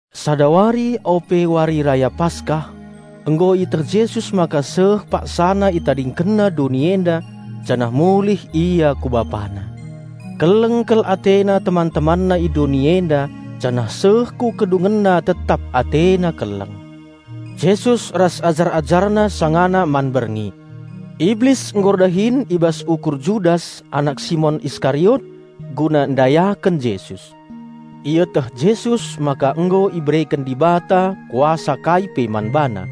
Sada wari ope Wari Raya Paskah, nggo ieteh Jesus maka seh PaksaNa ItadingkenNa doni enda janah mulih Ia ku BapaNa. Keleng kal AteNa teman-TemanNa i doni enda janah seh ku kedungenna tetap AteNa keleng. Jesus ras ajar-AjarNa sangana man berngi. Iblis nggo erdahin i bas ukur Judas anak Simon Iskariot guna ndayaken Jesus. Ieteh Jesus maka nggo ibereken Dibata kuasa kai pe man BaNa.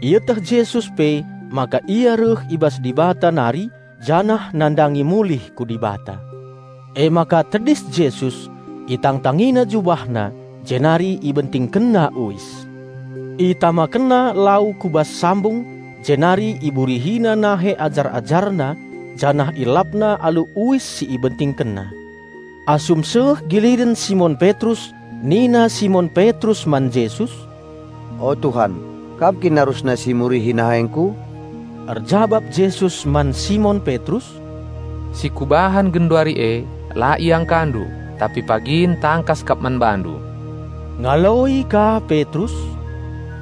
Ieteh Jesus pe maka Ia reh i bas Dibata nari janah nandangi mulih ku Dibata. Emaka tedis Jesus, itangtangina JubahNa, jenari IbentingkenNa uis. ItamakenNa lau ku bas sambung, jenari IburihiNa nahe ajar-AjarNa janah IelapNa alu uis si IbentingkenNa. Asum seh giliren Simon Petrus nina Simon Petrus man Jesus, "O Tuhan, Kam kin arusna si murihi nahengku?" Erjabap Jesus man Simon Petrus, "Si Kubahan genduari e, la iangkandu, tapi pagin tangkas kap man bandu." Ngaloi ka Petrus,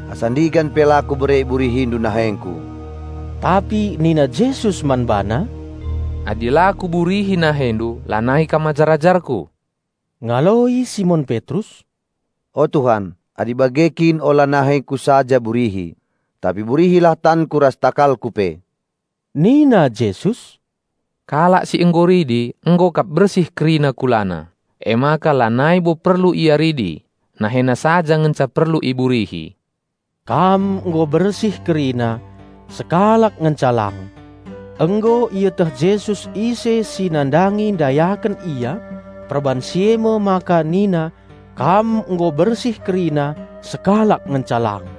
"Asa ndigan pe la kubere IburihiNdu nahengku!" Tapi nina Jesus man bana, "Adi la Kuburihi nahendu lanai kam ajar-ajarKu." Ngaloi Simon Petrus, "O Tuhan, adi bage kin ola nahengku saja burihi! Tapi burihilah tanku ras takalku pe!" Nina Jesus, "Kalak si nggo ridi nggo kap bersih kerina kulana, emaka lanai bo perlu ia ridi; nahena saja ngenca perlu iburihi." Kam nggo bersih kerina, sekalak ngenca lang. (Nggo ieteh Jesus ise si nandangi ndayaken Ia; perbahan si e me maka nina, "Kam nggo bersih kerina, sekalak ngenca lang.")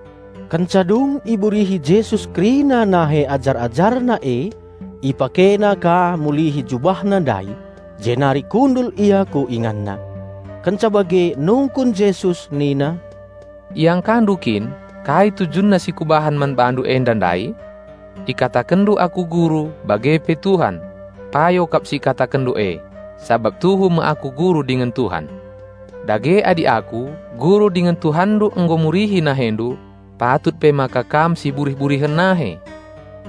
Kenca dung iburihi Jesus kerina nahe ajar-AjarNa e, IpakeNa ka mulihi JubahNa ndai, jenari kundul Ia ku InganNa. Kenca bage nungkun Jesus nina, "Iangkandu kin kai tujunna si Kubahan man bandu enda ndai? Ikatakenndu Aku Guru bage pe Tuhan. Payo kap si ikatakenndu e; sabap tuhu me Aku Guru dingen Tuhan. Dage adi Aku, Guru dingen Tuhanndu nggo murihi nahendu, patut pe maka kam siburih-burihen nahe.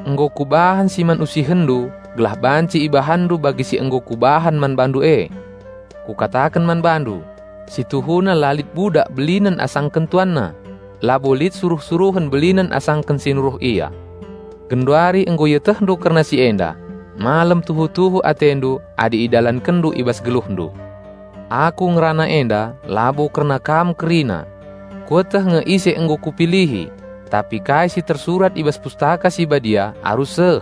Nggo Kubahan si man usihenndu gelah banci ibahanndu bagi si nggo Kubahan man bandu e. Kukataken man bandu: Situhuna la lit budak belinen asangken tuanna. Labo lit suruh-suruhen belinen asangken si nuruh ia. Genduari nggo ietehndu kerna si enda; malem tuhu-tuhu atendu adi idalankenndu i bas geluhndu. Aku ngerana enda labo kerna kam kerina. Kueteh nge ise nggo Kupilihi. Tapi kai si tersurat i bas Pustaka Si Badia arus seh.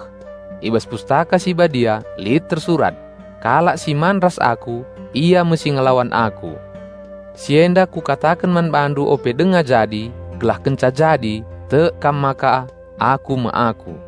I bas Pustaka Si Badia lit tersurat, 'Kalak si man ras Aku, ia me si ngelawan Aku.' Si enda Kukataken man bandu ope denga jadi, gelah kenca jadi, tek kam maka 'Aku me Aku.'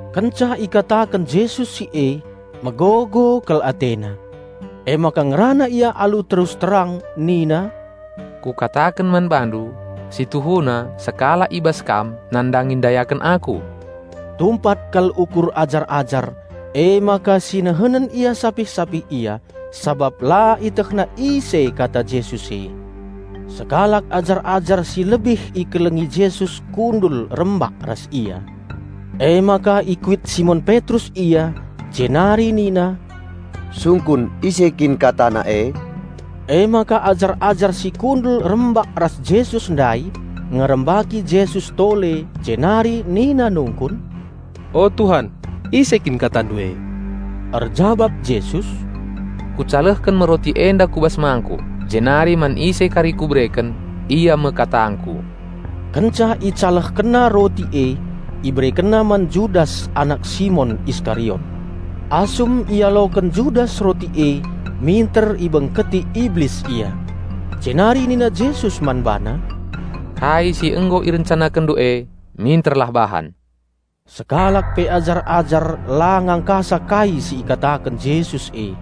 Kenca ikataken Jesus si e, megogo kal AteNa. Emaka ngerana Ia alu terus terang nina, "Kukataken man bandu, si tuhuna sekalak i bas kam nandangi ndayaken Aku." Tumpat kal ukur ajar-ajar, emaka sinihenen ia sapih-sapih ia, sabap la ietehna ise kata Jesus e. Sekalak ajar-ajar si lebih ikelengi Jesus kundul rembak ras Ia. Emaka ikuit Simon Petrus ia, jenari nina, "Sungkun ise kin KataNa e?" Emaka ajar-ajar si kundul rembak ras Jesus ndai ngerembaki Jesus tole jenari nina nungkun, "O Tuhan, ise kin KataNdu e?" Erjabap Jesus, "Kucalehken me roti enda ku bas mangkuk jenari man ise kari kubereken, ia me katangKu." Kenca IcalehkenNa roti e, IberekenNa man Judas anak Simon Iskariot. Asum ialoken Judas roti e minter ibengketi Iblis ia. Jenari nina Jesus man bana, "Kai si nggo irencanakenndu e, minterlah bahan!" Sekalak pe ajar-ajar la ngangkasa kai si ikataken Jesus e.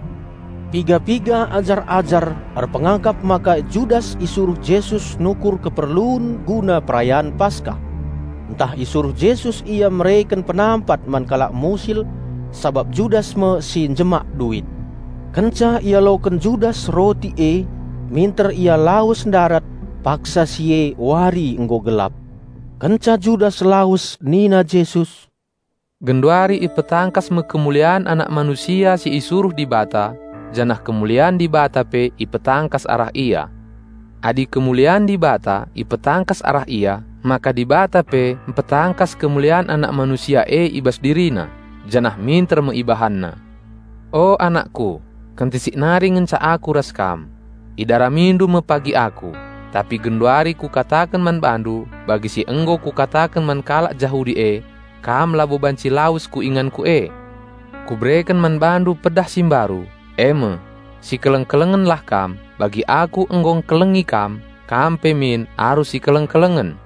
Piga-piga ajar-ajar erpengakap maka Judas isuruh Jesus nukur keperlun guna perayan Paskah; ntah isuruh Jesus ia mereken penampat man kalak musil, sabap Judas me si njemak duit. Kenca ialoken Judas roti e, minter ia lawes ndarat; paksa si e wari nggo gelap. Kenca Judas lawes nina Jesus, "Genduari ipetangkas me kemulian Anak Manusia si isuruh Dibata janah kemulian Dibata pe ipetangkas arah Ia. Adi kemulian Dibata ipetangkas arah Ia maka Dibata pe mpetangkas kemulian Anak Manusia e i bas DiriNa, janah minter me IbahanNa. O anakku, kentisik nari ngenca Aku ras kam. Idaramindu me pagi Aku. Tapi genduari Kukataken man bandu bagi si nggo Kukataken man kalak Jahudi e, 'Kam labo banci lawes ku inganKu e.' Kubereken man bandu pedah si mbaru, e me: Sikeleng-kelengenlah kam. Bagi Aku nggo engkelengi kam, kam pe min arus sikeleng-kelengen.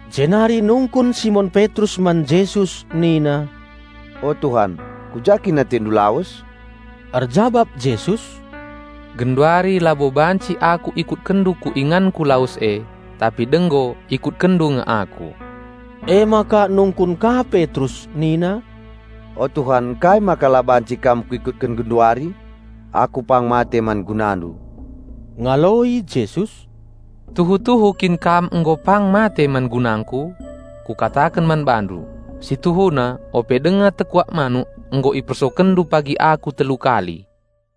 Jenari nungkun Simon Petrus man Jesus nina, "O Tuhan, ku ja kin AteNdu lawes?" Erjabap Jesus, "Genduari labo banci Aku ikutkenndu ku inganKu lawes e, tapi denggo ikutkenndu nge Aku." Emaka nungkun ka Petrus nina, "O Tuhan ngkai maka la banci Kam kuikutken genduari? Aku pang mate man GunaNdu." Ngaloi Jesus, "Tuhu-tuhu kin kam nggo pang mate man gunangKu?" Kukataken man bandu, "Si tuhuna ope denga tekuak manuk nggo ipersokenndu pagi Aku telu kali."